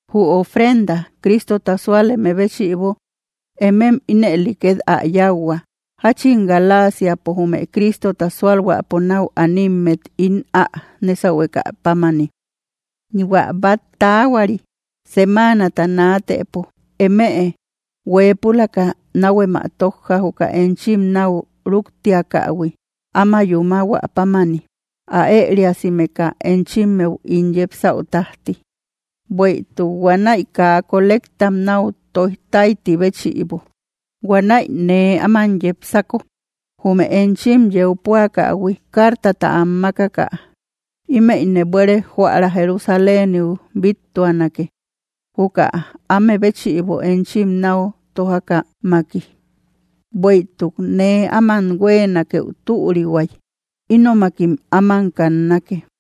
Jü ofrenda Cristota súaleme béchïbo, emem ínëli ket ä yauhua, jachin Galasiapo jume Cristota sualhuäpo nau animmet ín ä nésahuekä pámani. Huä bat taahuari semanata naatëpo, emëe huepülaka nahuem ä tojja juka enchim nau ruktiakähui áma yúmahuä pámani, ä eriasimeka enchimmeu ín yepsäu tajti, bueïtuk huanäi kaa kolectam nau toijtaiti béchïbo. Huanäi nee áman yépsako, jume enchim yeu puakähui cartata am makaka, imëyne buere joära Jerusaléniu bittuanake, juka amebéchïbo enchim nau tojakämaki. Bueïtuk nee aman huenakëu türihuay, ínomakim áman kannake.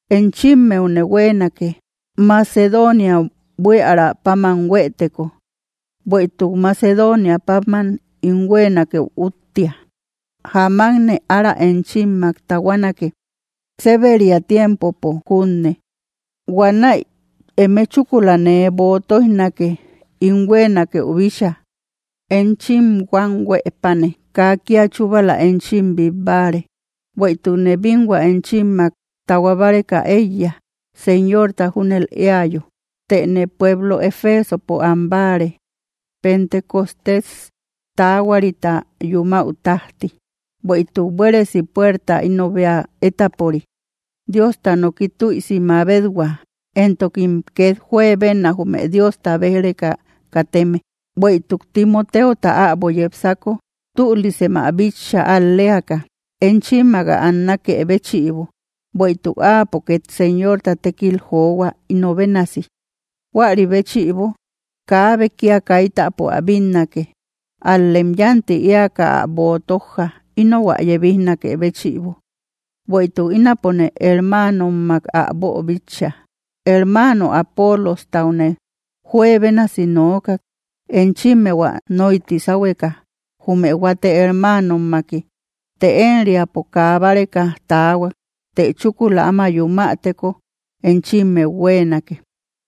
Enchimmeune huenake, Macedonia buiära páman hueeteko, bueïtuk Macedonia páman ín huenakëu úttia. Jáamakne ára enchimak tahuanake, seberia tiempopo junne, huanäi eme chúkula nee boo toijnake ín huenakëu bícha. Enchim huam huëpatne kaa kia chubala enchim bit báare, bueïtukne binhua enchimmak tahua báreka eiya, Señorta júnel eayo. Tëne pueblo Efesopo ambáare Pentecostés tahuarita yúmäu tajti, bueïtuk buéresi puerta ino bea étapori, Diosta noki tüisi mabethua, entokim ket juebenna jume Diosta bej‑reka kateme. Bueïtuk Timoteota äbo yépsako, tülisem ä bitcha al‑leaka enchimmak ä annakë béchïbo, bueïtuk áapo ket Señorta tekil johua ino bénasi. Juäri béchïbo, kaabe kia kaitäpo ä bínnake, al‑lem yanti eaka ä boo tojja, inou ä yebijnakë béchïbo, bueïtuk ínapone hermanommak ä boobíchaïhui. Hermano Apolostaune juebénasi nookak, enchimmeu ä noyti sahueka jume huate hermanommaki, të enriapo kaa báreka taahuak; të chúkula áma yumäteko enchimmeu huenake.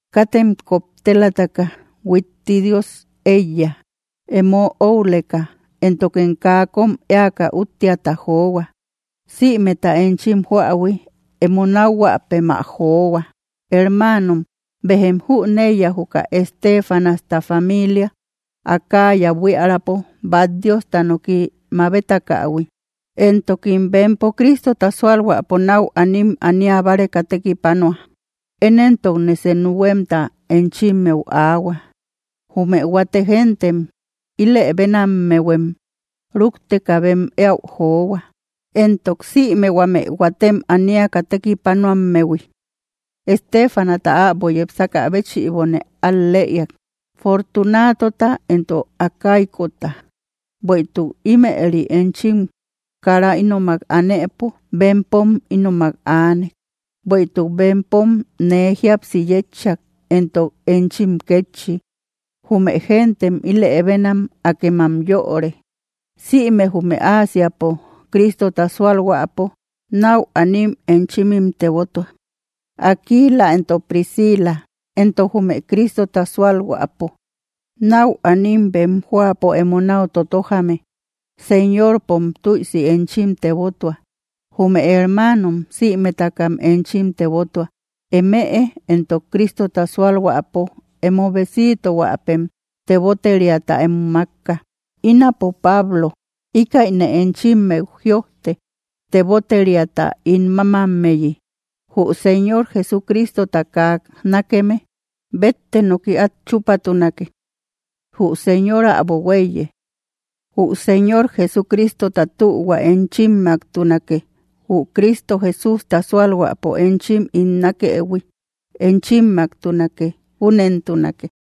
Katem koptelaka huitti Dios eiya, emo oüleka, éntokem kaa kom eaka úttiata johua. Sïmeta enchim juähui emo nakhuapem ä johua. Hermanom, bejem jüneiya juka Estéfanasta familia, Acaya buiärapo bat Diosta noki mabetakähui, entokim bempo Cristota sualhuäpo nau anim ania báreka tekipanua. Én entokne senu huemta enchimmeu aahua, jume huate gentem ilëbenamehuem rukteka bem eäu johua, entok sïme huame huatem aniaka tekipanuammehui. Estefanasta äbo yepsaka béchïbone al‑lëeak, Fortunatota, entok Acaicota, bueïtuk ïmeri enchim kara ínomak anëpo bempom ínomak aanek. Bueïtuk bempom nee jíapsi yetchak, entok enchim kétchi, jume gentem ilëbenam akem am yöre. Sïme jume Ásiapo Cristota sualhuäpo nau anim enchimim tebotua. Aquila entok Príscila, entok jume Cristota sualhuäpo nau anim bem joapo emo nau totojame, Señorpom tüisi enchim tebotua. Jume hermanom sïmetakam enchim tebotua. Emëe entok Cristota sualhuäpo emo besitohuapem teboteriata emo makka. Ínapo, Pablo, ikaïne enchimmeu jïojte teboteriata ín mamammeyi. Jü Señor Jesucristota kaa nákeme, bette noki at chupatunake. Jü Señor äbo huéiye. Jü Señor Jesucristota tühua enchimmaktunake. Jü Cristo Jesústa sualhuäpo enchim ín nakëhui, enchimmaktunake. Júnentunake.